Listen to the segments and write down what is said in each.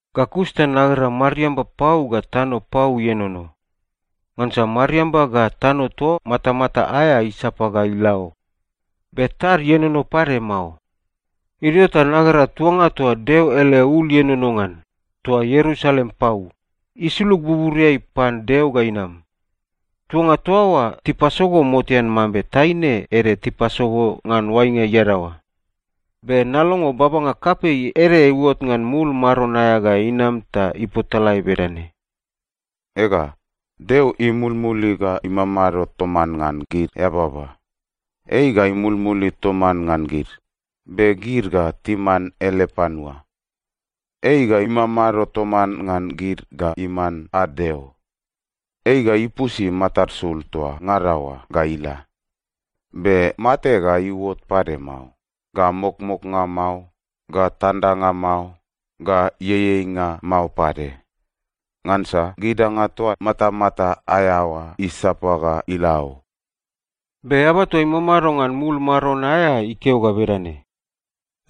Ga kus ta nagera mariamba pau ga tano pau ienono. Ngansa mariamba ga tano toa matamata aea isapa ga ila o. Be tad ienono pade mao. Idio ta nagera tuanga toa Deo ele ul ienono ngan, toa Ierusalem pau, isulug buburiai pan Deo ga inam. Tuanga toa oa tipasogo motean mambe taine ede tipasogo ngan oainga iadaoa. Be nalongo babanga kapei ede iuot ngan mul maron aea ga inam ta ipotalae bedane, “Ega, Deo imulmuli ga imamado toman ngan gid eababa! Ei ga imulmuli toman ngan gid, be gid ga timan ele panua. Ei ga imamado toman ngan gid ga iman ad Deo. Ei ga ipusi matad sul toa ngada oa ga ila. Be mate ga iuot pade mao, ga mokmoknga mao, ga tandanga mao, ga ieieinga mao pade. Ngansa gid danga toa matamata aea oa isapa ga ila o!” Be Eaba toa imamado ngan mul maron aea ikeo ga bedane,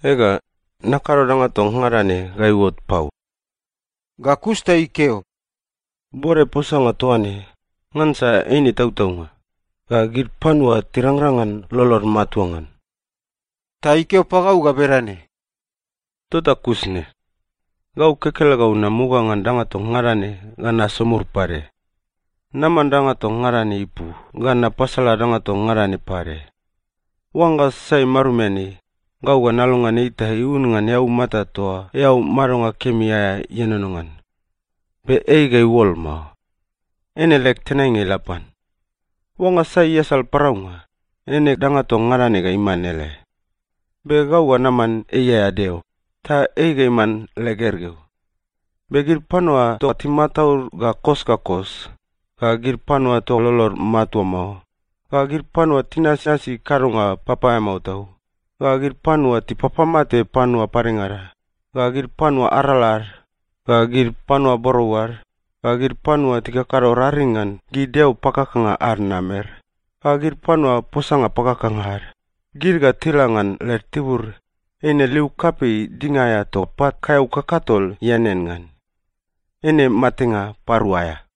“Ega, nakado danga toa ngada ne ga iuot pau!” Ga kus ta ikeo, “Bode posanga toaine, ngansa eine tautaunga, ga gid panua tirangrang ngan lolod matua ngan.” Ta ikeo pagau ga bedane, “Tota kus ne. Gau kekelegau namuga ngan danga toa ngada ne ga nasomur pade. Naman danga toa ngada ne ipu ga napasala danga toa ngada ne pade. Oangga sai marumian ei, gau ga nalongean ei ta iun ngan eaumata toa eau madonga kemi aea ienono ngan. Be ei ga iuol mao. Eine leg tenainga ila pan. Oangga sai iasal paraunga, eine danga toa ngada ne ga iman ei ele. Be gau ga naman ei aea Deo, ta ei ga iman leg gergeu. Be gid panua toa timataud ga kos ga kos, ga gid panua toa lolod matua mao, ga gid panua tinasnasi kadonga papaeamao tau, ga gid panua tipapamate panua padengada, ga gid panua arala ad, ga gid panua borou ad, ga gid panua tikakado raring ngan gid deo pakakanga ad namer, ga gid panua posanga pakakanga ad, gid ga tila ngan led tibur, eine liu kapei dinga aea toa pat kaeau kakatol ianean ngan. Eine matenga parua aea.”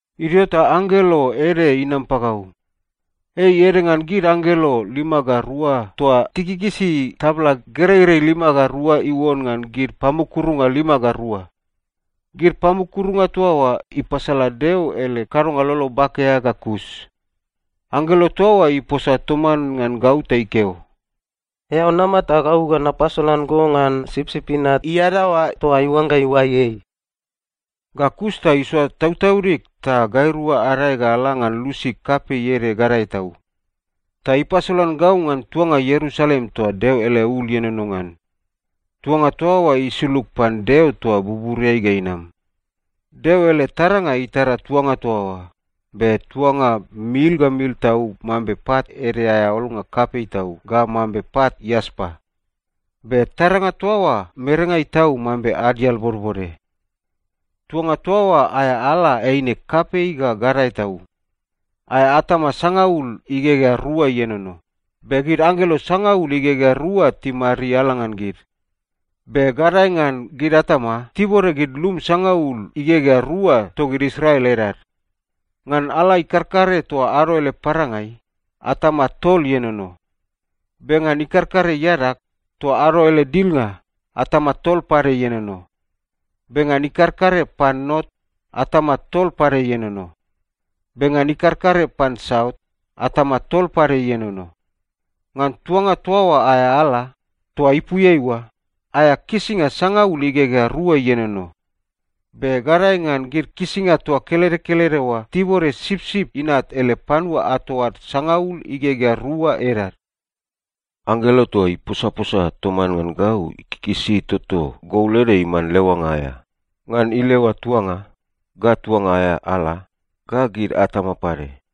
Idio ta anggelo ede inam pagau. Ei ede ngan gid anggelo lima ga rua toa tikikisi tabla gereirei lima ga rua iuon ngan gid pamukurunga lima ga rua. Gid pamukurunga toa oa ipasala Deo ele kadonga lolo bake aea ga kus. Anggelo toa oa iposa toman ngan gau ta ikeo, “Eao nama ta gau ga napasolan go ngan Sipsip Inat iadaoa toa iuangga iuai ei.” Ga kus ta isoa tautaudig ta gairua adae ga ala ngan lusi kapei ede gadae tau. Ta ipasolan gau ngan tuanga Ierusalem toa Deo ele ul ienono ngan. Tuanga toa oa isulug pan Deo toa buburiai ga inam. Deo ele taranga itara tuanga toa oa, be tuanga mil ga mil tau mambe pat ede aea olnga kapei tau ga mambe pat iaspa. Be taranga toa oa merengai tau mambe adial bodbode. Tuanga toa oa aea ala eine kapei ga gadae tau. Aea atama sangaul igegea rua ienono, be gid anggelo sangaul igegea rua timariala ngan gid. Be gadae ngan gid atama, tibode gid lum sangaul igegea rua togid Israel edad. Ngan ala ikarkare toa ado ele parangai, atama tol ienono. Be ngan ikarkare iadag, toa ado ele dilngai, atama tol pade ienono. Be ngan ikarkare pan not, atama tol pade ienono. Be ngan ikarkare pan saut, atama tol pade ienono. Ngan tuanga toa oa aea ala, toa ipuiai oa, aea kisinga sangaul igegea rua ienono. Be gadae ngan gid kisinga toa kelede kelede oa tibode Sipsip Inat ele panua ato ad sangaul igegea rua edad. Anggelo toa iposaposa toman ngan gau ikikisi toto gol ede iman leoanga aea, ngan ileoa tuanga, ga tuanga aea ala, ga gid atama pade.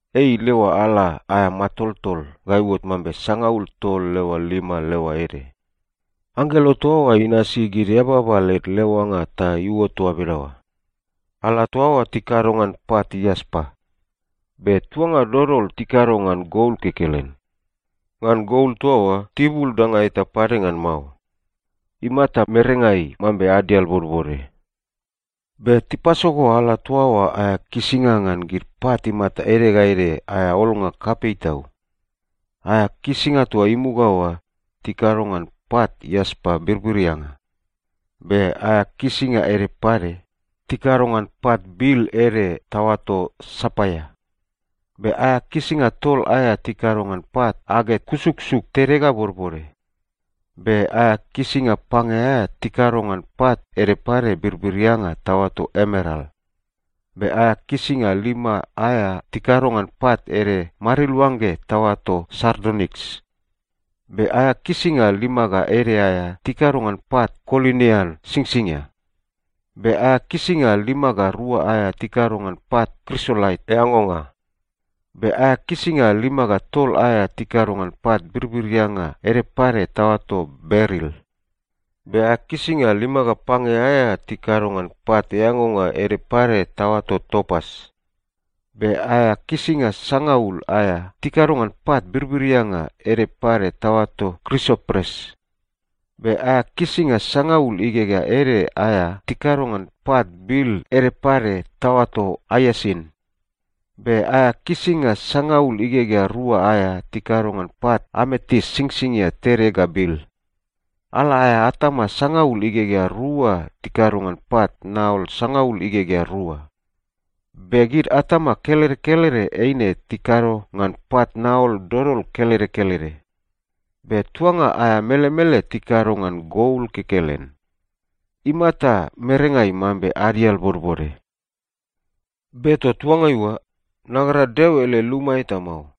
Ei ileoa ala aea matoltol ga iuot mambe sangaul tol leoa lima leoa ede. Anggelo toa oa inasi gid eababa led leoanga ta iuot toa bedaoa. Ala toa oa tikado ngan pat iaspa. Be tuanga dodol tikado ngan gol kekelen. Ngan gol toa oa, tibul danga eta pade ngan mao. Imata merengai mambe adial bodbode. Be tipasogo ala toa oa aea kisinga ngan gid pat imata ede ga ede aea olnga kapei tau. Aea kisinga toa imuga oa, tikado ngan pat iaspa birbirianga. Be aea kisinga ede pade, tikado ngan pat bil ede taoato sapaia. Be aea kisinga tol aea tikado ngan pat aget kusuksuk tede ga bodbode. Be aea kisinga pange aea tikado ngan pat ede pade birbirianga taoato emeral. Be aea kisinga lima aea tikado ngan pat ede mariluangge taoato sardoniks. Be aea kisinga lima ga ede aea tikado ngan pat konilian singsingia. Be aea kisinga lima ga rua aea tikado ngan pat krisolait eangonga. Be aea kisinga lima ga tol aea tikado ngan pat birbirianga ede pade taoato beril. Be aea kisinga lima ga pange aea tikado ngan pat eangonga ede pade taoato topas. Be aea kisinga sangaul aea tikado ngan pat birbirianga ede pade taoato krisopres. Be aea kisinga sangaul igegea ede aea tikado ngan pat bil ede pade taoato aiasin. Be aea kisinga sangaul igegea rua aea tikado ngan pat ametis singsingia tede ga bil. Ala aea atama sangaul igegea rua tikado ngan pat naol sangaul igegea rua. Be gid atama kelede kelede eine tikado ngan pat naol dodol kelede kelede. Be tuanga aea melemele tikado ngan gol kekelen. Imata merengai mambe adial bodbode. Be toa tuangai oa, nagera Deo ele luma eta mao.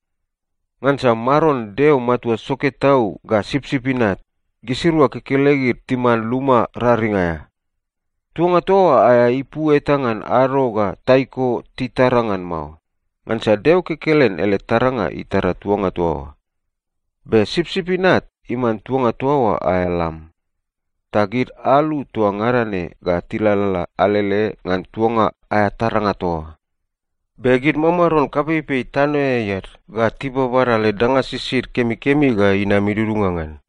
Ngansa Maron Deo Matua Soke Tau ga Sipsip Inat, gisirua kekelegid timan luma raring aea. Tuanga toa oa aea ipu eta ngan ado ga taiko titara ngan mao, ngansa Deo kekelen ele taranga itara tuanga toa oa. Be Sipsip Inat iman tuanga toa oa aea lam. Ta gid alu toa ngada ne ga tilalala alele ngan tuanga aea taranga toa oa. Be gid mamaron kapeipei tanoeai ad ga tibabada led danga sisid kemikemi ga inam idudunga ngan.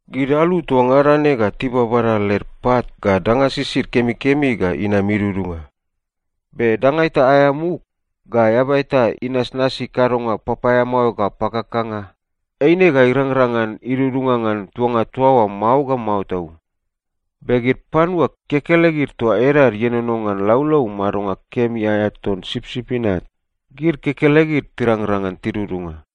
Gid alu toa ngada ne ga tibabada led pat ga danga sisid kemikemi ga inam idudunga. Be danga eta aea muk, ga eaba eta inasnasi kadonga papaeamao ga pakakanga, eine ga irangrang ngan idudunga ngan tuanga toa oa mao ga mao tau. Be gid panua kekelegid toa edad ienono ngan laulau madonga kemi aea ton Sipsip Inat, gid kekelegid tirangrang ngan tidudunga.